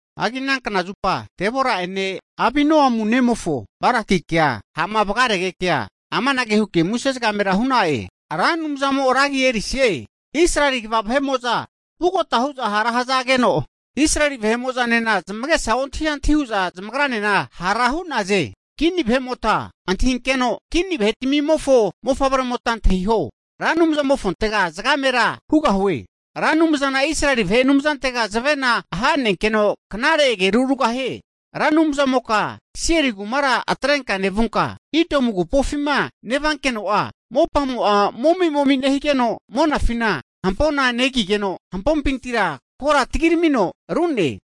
Hagi ana knazupa Debora'ene Abinoamu nemofo Barakikea ha'ma vagaregekea amanage huke muse zagamera hu'na'e, Ra Anumzamo ragi erisie! Israeli kva vahe'mo'za vugota hu'za hara hazageno, Israeli vahe'mo'zanena zamagesa ontahi antahi hu'za zamagranena hara hu'naze. Kini vahe'mota nentahinkeno, kini vahe'tmimofo mofavremota antahio, Ra Anumzamofontega zagamera hugahue, Ra Anumzana Israeli vahe Anumzantega zavena ahanenkeno knare ageru rugahie. Ra Anumzamoka Seiri kumara atrenka nevunka, Idomu agupofima nevankeno'a mopamo'a momi'momi nehigeno, monafina hampona negigeno, hampopintira kora tagiramino ru'ne.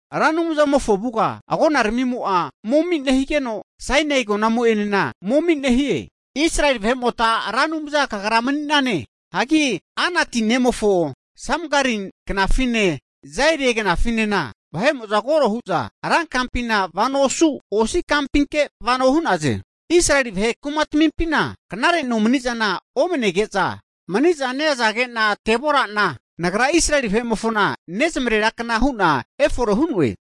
Ra Anumzamofo avuga agonaramimo'a momi nehigeno, Sainai agonamo'enena momi nehie. Israeli vahe'mota Ra Anumza Kagra mani'nane. Hagi Anati nemofo Samgari knafine, Jaeli knafinena vahe'mo'za koro hu'za ra kampina vano osu, osi' kampinke vano hu'naze. Israeli vahe kumatamimpina knare nomanizana omanege'za maniza neazage'na Deborana nagra Israeli vahe'mofona nezamarera kna hu'na efore hu'noe.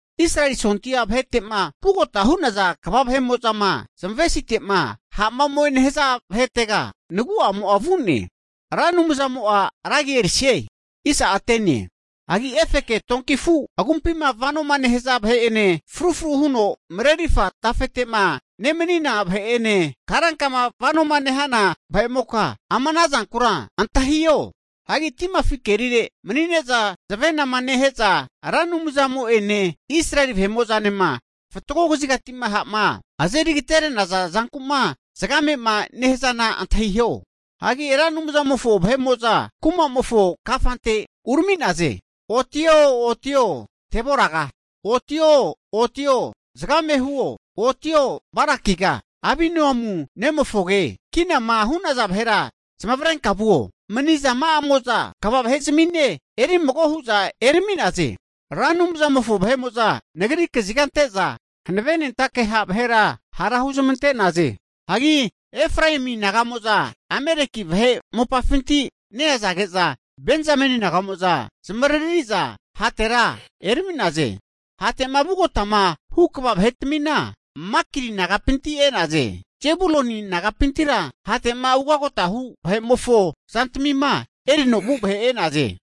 Israeli sondia vahete'ma vugota hu'naza kva vahe'mo'zama zamavesite'ma ha'ma ome nehaza vahetega nagu'amo'a vu'ne. Ra Anumzamo'a ra agi erisie! Hagi efeke donki afu' agumpima vanoma nehaza vahe'ene frufru huno marerirfa tafete'ma nemanina vahe'ene, karankama vanoma nehana vahe'moka ama ana zankura antahio. Hagi timafi kerire mani'ne'za zavenama nehe'za Ra Anumzamo'ene Israeli vahe'mo'zanema fatgo kazigati'ma ha'ma azeri agatere'naza zanku'ma zagame'ma nehazana antahiho. Hagi Ra Anumzamofo vahe'mo'za rankuma'mofo kafante urami'naze. Otio, otio, Deboraga! Otio, otio, zagame huo! Otio, Barakiga, Abinoamu nemofoge, kinama hu'naza vahera zamavarenka vuo. Manizama'amo'za kva vahe'zamine erimago hu'za erami'naze. Ra Anumzamofo vahe'mo'za nagri kaziga ante'za hanavenentake ha' vahera hara huzmante'naze. Hagi Efraemi naga'mo'za Ameleki vahe mopafinti neazage'za Benzameni naga'mo'za zamavariri'za hatera erami'naze. Hate'ma vugotama hu kva vahe'tmina, Makiri nagapinti e'naze. Zebuluni nagapintira hate'ma ugotama hu vahe'mofo zantamima erino vu vahe e'naze.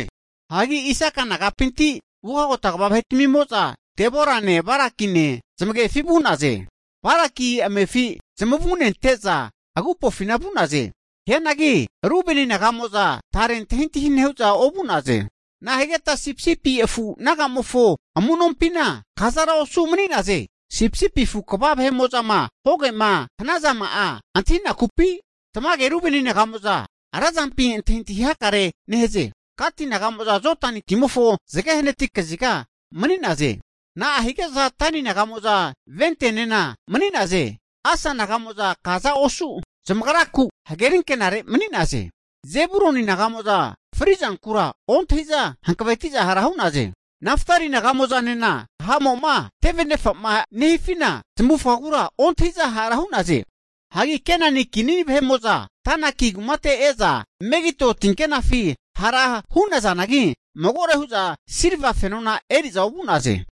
Hagi Isaka nagapinti ugagota kva vahe'tmimo'za Deborane Barakine zamagefi vu'naze. Baraki amefi zamavunente'za agupofina vu'naze. Hianagi Rubeni naga'mo'za tare antahintahi nehu'za ovu'naze. Nahigeta sipisipi afu naga'mofo amu'nompina kazara osu' mani'naze. Sipisipi afu kva vahe'mo'zama hogema hanazama'a antahinakupi? Tamage Rubeni naga'mo'za razampi antahintahi hakarea nehaze. Gati naga'mo'za Jodani timofo zage hanati kaziga mani'naze. Na'a hige'za Dani naga'mo'za ventenena mani'naze? Asa naga'mo'za kaza osu zamagraku hageri ankenare mani'naze. Zebuluni naga'mo'za frizankura ontahi'za hanavetiza hara hu'naze. Naftali naga'mo'zanena ha'mo'ma tevenefama nehifina zamavufagagura ontahi'za hara hu'naze. Hagi Kenani kini vahe'mo'za Tanaki kumate e'za Megido tinkenafi hara hu'nazanagi, magore hu'za silva fenona eri'za ovu'naze.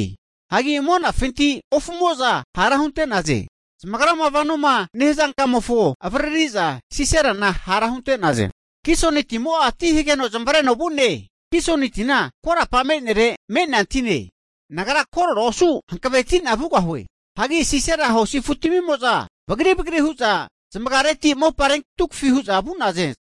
Hagi monafinti ofumo'za hara hunte'naze. Zamagrama vanoma nehaza kamofo avaririza Siserana hara hunte'naze. Kisoni timo'a ti hageno zamavareno vu'ne, Kisoni tina korapa me'nere me'nea tine. Nagra korora osu hankaveti'na vugahue. Hagi Sisera hosi afutamimo'za vagri vagri hu'za zamagareti mopa rentunkafiza vu'naze.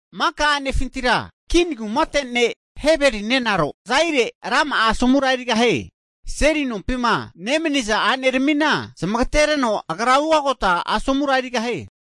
Maka a'nefintira Kin kumate ne' Heberi nenaro Jaeli rama'a asomura erigahie. Seli nompima nemaniza a'neramina zamagatereno, agra ugota asomura erigahie.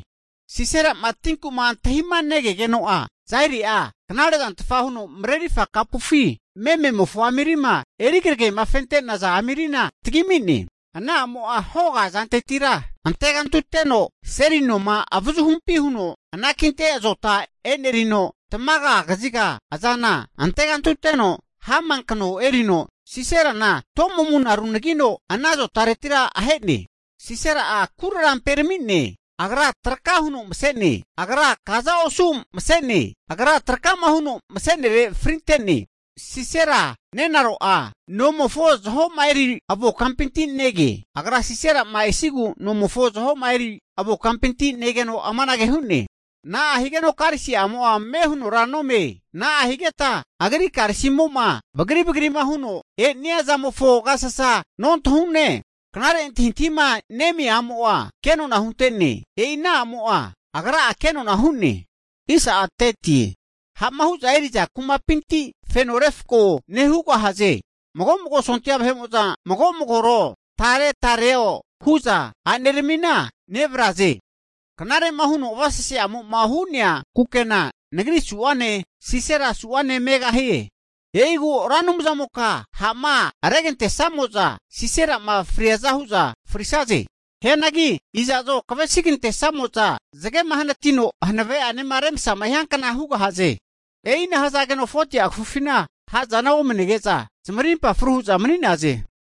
Sisera'ma tinku'ma antahima negegeno'a Jaeli'a knarezantfa huno marerirfa kapufi mememofo amirima eri kragemafente'naza amirina tagimi'ne. Ana a'mo'a hoga azantetira antegantuteno seli noma avazuhumpi huno anakinte azota e'nerino, tamaga kaziga azana antegantuteno hama kano erino, Siserana to'mamuna runagino ana zotanura ahe'ne. Sisera'a kuraramperami'ne, agra traka huno mase'ne, agra kaza osu mase'ne, agra trakama huno masere frinte'ne. Sisera nerera'a nomofo zahoma eri avo kampinti nege. Agra Sisera'ma esigu nomofo zahoma eri avo kampinti negeno amanage hu'ne. Na'ahigeno karisi'amo'a ame hunora nome? Na'ahigeta agri karisimo'ma bagri bagrima huno e'nia zamofo agasasa nontahune? Knare antahintahima nemia a'mo'a kenona hunte'ne. E'i ana a'mo'a agra'a kenona hu'ne. Ha'ma hu'za eri'za kumapinti feno refko nehugahaze. Mago'mago sontia vahe'mo'za mago magoro tare tarero hu'za a'neramina nevare'za, knare'ma huno avasesema'amo'ma hu'nea kukena nagri su'ane, Sisera su'ane megahie. E'igu Ra Anumzamoka ha'ma aregantesamo'za Siserama friaza hu'za frisaze! Hianagi iza'zo kavesigantesamo'za zagema hanatino hanave'anema remasama hiankna hugahaze. E'ina hazageno 40'a kafufina ha'zana omanege'za Israeli vahe'mo'za zamarimpa fru hu'za mani'naze.